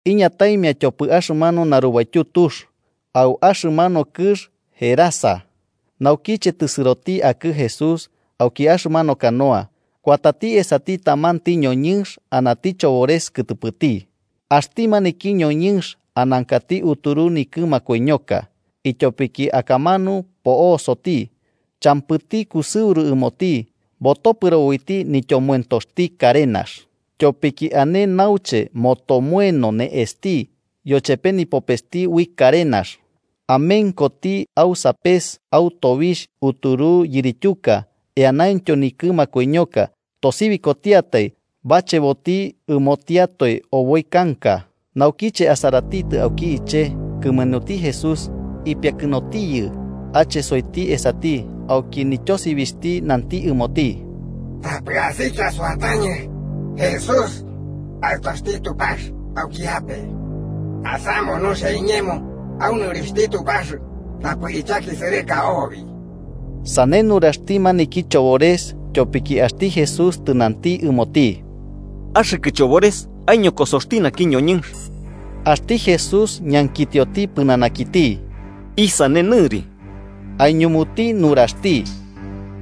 Iñataimia tyopɨ axɨmanu narubaityu tux, au axɨmanu kɨx Gerasa. Naukiche tɨsɨroti akɨ Jesús auki axɨmanu canoa, kuatati esati tamanti ñoñɨnx anati chobores kɨtɨpɨti. Axti maniki ñoñɨnx anankati uturu nikɨ makoiñoka, ityopiki akamanu po'osoti. Champɨti kusɨuru ɨmoti, botopɨro uiti nityomoentopxti karenax. Tyopiki ane auche motomoeno ne'esti yochepe nipopesti ui karenax. Amenkoti au sapes au tobixh uturu yirityuka eanaintyo nikɨ makoiñoka, tosibikotiatai bacheboti ɨmotiatoe oboi kanka. Naukiche asaratitɨ auki iche'e kɨmenuti Jesús, ipiakɨnotiyɨ, achesoiti esati auki nityosibixhti nanti ɨmoti: –¡Tapɨ asikia suatañɨ, Jesús, Aɨtoxti Tupax auki ape! ¡Asamu nuxia iñemo au nɨrixhti Tupax tapɨ ichakisɨrɨka obi! Sane nuraxti maniki chobores tyopiki axti Jesús tɨnanti ɨmoti: –¡Axɨkɨ chobores aiñokosoxti naki ñoñɨnx! Axti Jesús ñankitioti pɨnanakiti: –¿Isane nɨri? Aiñumuti nuraxti: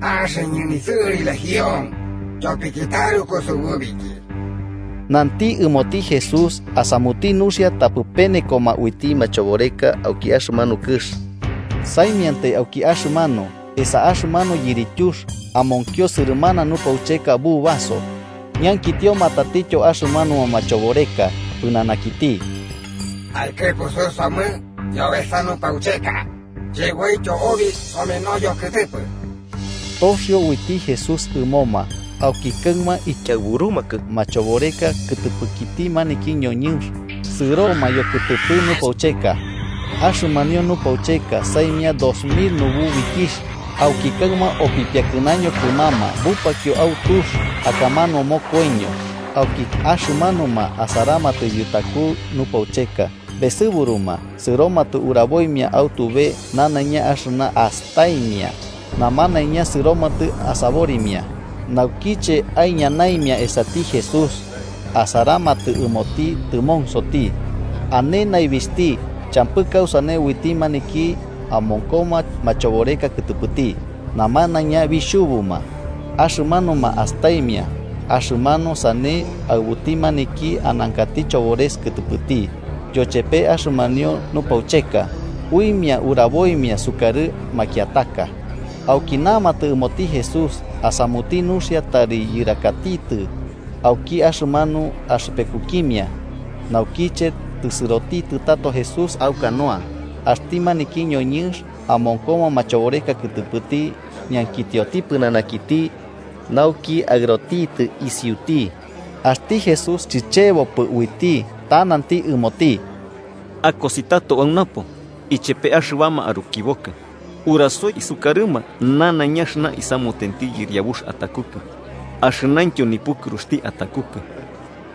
–Axɨñɨ nisɨri Legión, tyopiki taruku sububiki. Nanti ɨmoti Jesús asamuti nuxia tapɨ penekoma uiti machoboreka auki axɨmanu kɨx. Saimiantai auki axɨmanu, esa axɨmanu yirityux, amonkio sɨrɨmana nupaucheka bubaso, ñankitioma tatityo axɨmanuma machoboreka pɨnanakiti: –Aikɨpusu somɨ yobesa nupaucheka, cheboityo obi someno yokɨtɨpɨ. Toxio uiti Jesús ɨmoma, auki axɨmanu ikiaɨburumakɨ machoboreka kɨtɨpɨkiti maniki ñoñɨnx sɨroma yokɨtɨpɨ nupaucheka. Axɨmanio nupaucheka, saimia dos mil nububikixh, auki axɨmanu opipiakɨnaño kɨmama bupakio au tux, akamanu mokoiño. Auki axɨmanuma asaramatɨ yutaku nupaucheka besɨburuma, sɨromatɨ uraboimia au tube nanaiña axɨna astaimia. Namanaiña sɨromatɨ asaborimia. Naukiche aiñanaimia esati Jesús, asaramatɨ ɨmoti tɨmonsoti, ane naibixhti champɨ kausane uiti maniki amonkoma machoboreka kɨtɨpɨti. Namanaiña bixhubuma, axɨmanuma astaimia axɨmanu sane aɨbuti maniki anankati chobores kɨtɨpɨti yochepe axɨmanio nupaucheka, uimia uraboimia sukarɨ makiataka. Auki namatɨ ɨmoti Jesús asamuti nuxia tari yɨrakatitɨ auki axɨmanu axɨpekukimia. Naukiche tɨsɨroti tato Jesús au canoa, axti maniki ñoñɨnx amonkoma machoboreka kɨtɨpɨti ñankitioti pɨnanakiti nauki aɨrotitɨ isiuti. Axti Jesús chicheboɨ uiti, ta nanti ɨmoti: –Akosi tato au napo, ichepe axɨbama arukibokɨ, urasoi isukarɨma nanaiña axɨna isamutenti Yɨriabux atakukɨ, axɨnaintyo nipukɨruxti atakukɨ.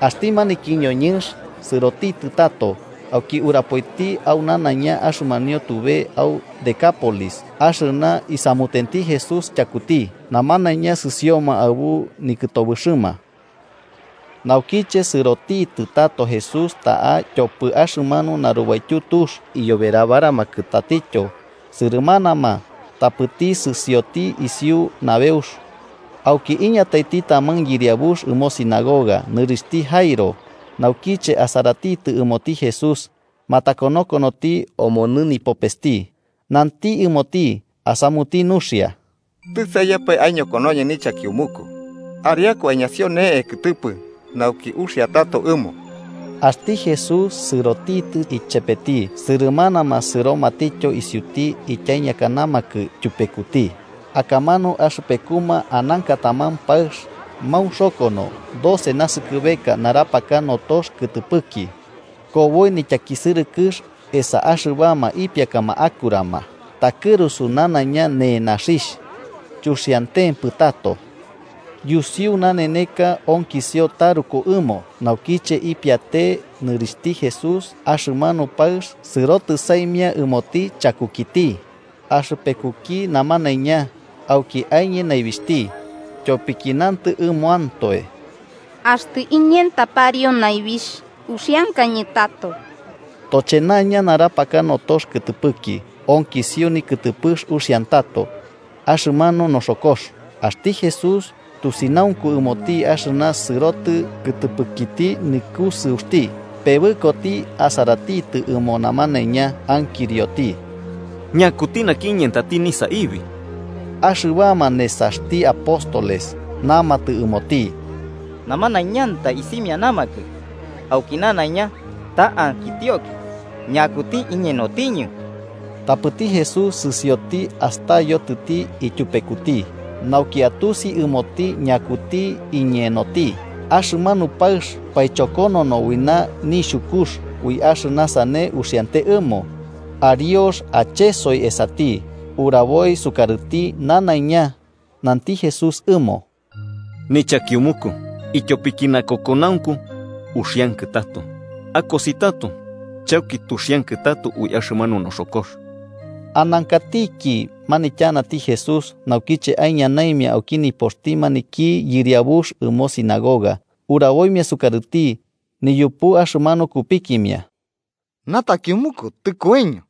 Axti maniki ñoñɨnx sɨrotitɨ tato, auki urapoiti au nanaiña axɨmanio tube au Decápolis axɨna isamutenti Jesús tyakuti. Namanaiña sɨsioma aɨbu nikɨtobɨxɨma. Naukiche sɨrotitɨ tato Jesús ta'a tyopɨ axɨmanu narubaityu tux, iyoberabaramankɨ tatityo sɨrɨmanama, tapɨti sɨsioti isiu nabeux. Auki iñataiti taman yɨriabux ɨmo sinagoga, nɨrixhti Jairo, naukiche asaratitɨ ɨmoti Jesús matakonokonoti omonɨ nipopesti nanti ɨmoti, asamuti nuxia: –Tɨ saimiampae aiñokonoñɨ nichakiumuku. Ariaku aiñasio ne'e kɨtɨpɨ, nauki uxia tato ɨmo. Axti Jesús sɨrotitɨ ichepeti, sɨrɨmanama sɨromatityo isiuti ityaiñakanamakɨ tyupekuti. Akamanu axɨpekuma ananka taman paɨx maunxokono doce naskɨbeka, narapaka notox kɨtɨpɨki. Koboi nityakisɨrɨkɨx esa axɨbama ipiakama akurama, takɨrusu nanaiña nenaxixh, chuxiantempɨ tato. Yusiu naneneka onkisio taruku ɨmo. Naukiche ipiate'e nɨrixhti Jesús, axɨmanu paɨx sɨrotɨ saimia ɨmoti chakukiti, axɨpekuki namanaiña, auki aiñe naibixhti. Tyopiki nantɨ ɨmoantoe: “Axtɨ iñenta pariu naibixh, uxiankañɨ tato.” Tochenaña, narapaka notox kɨtɨpɨki, onkisio nikɨtɨpɨx uxiantato axɨmanu noxokox. Axti Jesús, tusinaunku ɨmoti axɨna sɨrotɨ kɨtɨpɨkiti nikusɨuxti, pebɨkoti asaratitɨ ɨmo namanaiña, ankirioti: –¿Ñakuti naki iñentati nisaibi? Axɨbama nesaxti apóstoles namatɨ ɨmoti: –Namanaiñantai isimianamakɨ auki nanaiña, ta ankitioki ‘¿Ñakuti iñenotiñɨ?’ Tapɨti Jesús sɨsioti astayotitɨ ityupekuti, nauki atusi ɨmoti ñakuti iñenoti. Axɨmanu paɨx, paichokonono ui nixhukux ui axɨna sane uxiante ɨmo, ariox achesoi esati, uraboi sukarɨti nanaiña. Nanti Jesús ɨmo: –Nichakimuku, ityopiki nakokonaunku uxiankɨ tato. Akosi tato chauki tuxiankɨ tato ui axɨmanu noxokox. Anankatiki manityanati Jesús, naukiche aiñanaimia auki nipoxti maniki yɨriabux ɨmo sinagoga uraboimia sukarɨti niyupu axɨmanu kupikimia: –Natakiumuku tɨkoiño.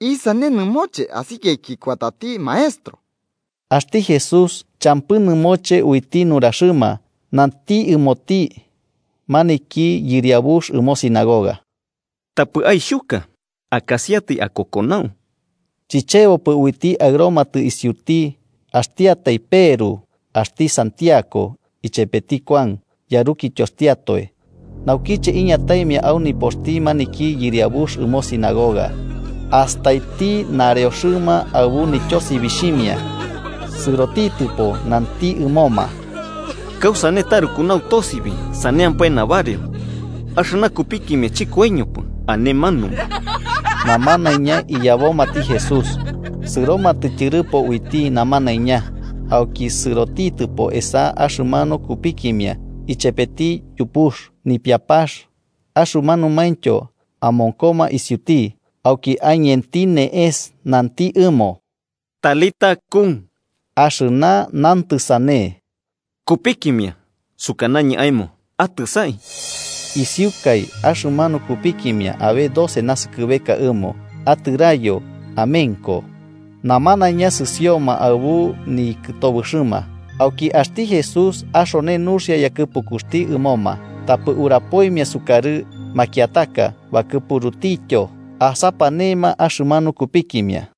¿Isane nɨmoche asikiaiki kuatati maestro? Axti Jesús, champɨ nɨmoche uiti nuraxɨma, nanti ɨmoti maniki yɨriabux ɨmo sinagoga: –Tapɨ aixhuka. Akasiatai akokonau. Chichebopɨ uiti aɨromatɨ isiuti axtiatai Peru, axti Santiago ichepeti Kuan, yarukityoxtiatoe. Naukiche iñataimia au nipoxti maniki yɨriabux ɨmo sinagoga astaiti nareoxɨma aɨbu nityosibixhimia, sɨrotitɨpo nanti ɨmoma: –¿Kausane taruku nautosibi saneampae nabareo? Axɨna kupikimia chɨkoiñopɨ, ane manumu. Namanaiña iyabomati Jesús, sɨromatɨ tyɨrɨpo uiti namanaiña, auki sɨrotitɨpo esa axɨmanu kupikimia ichepeti yupux, nipiapax axɨmanumaintyo amonkoma isiuti. Auki aiñenti ne'es nanti ɨmo: –Talitá, cum (axɨna nantɨ sane: “Kupikimia, sukanañɨ aemo, atɨsai.”) Isiukai, axɨmanu kupikimia, abe doce naskɨbeka ɨmo, atɨraiyo amenko. Namanaiña sɨsioma aɨbu nikɨtobɨxɨma. Auki axti Jesús axone nuxia yakɨpukuxti ɨmoma: tapɨ urapoimia sukarɨ makiataka, bakɨpurutityo asapanema axɨmanu kupikimia.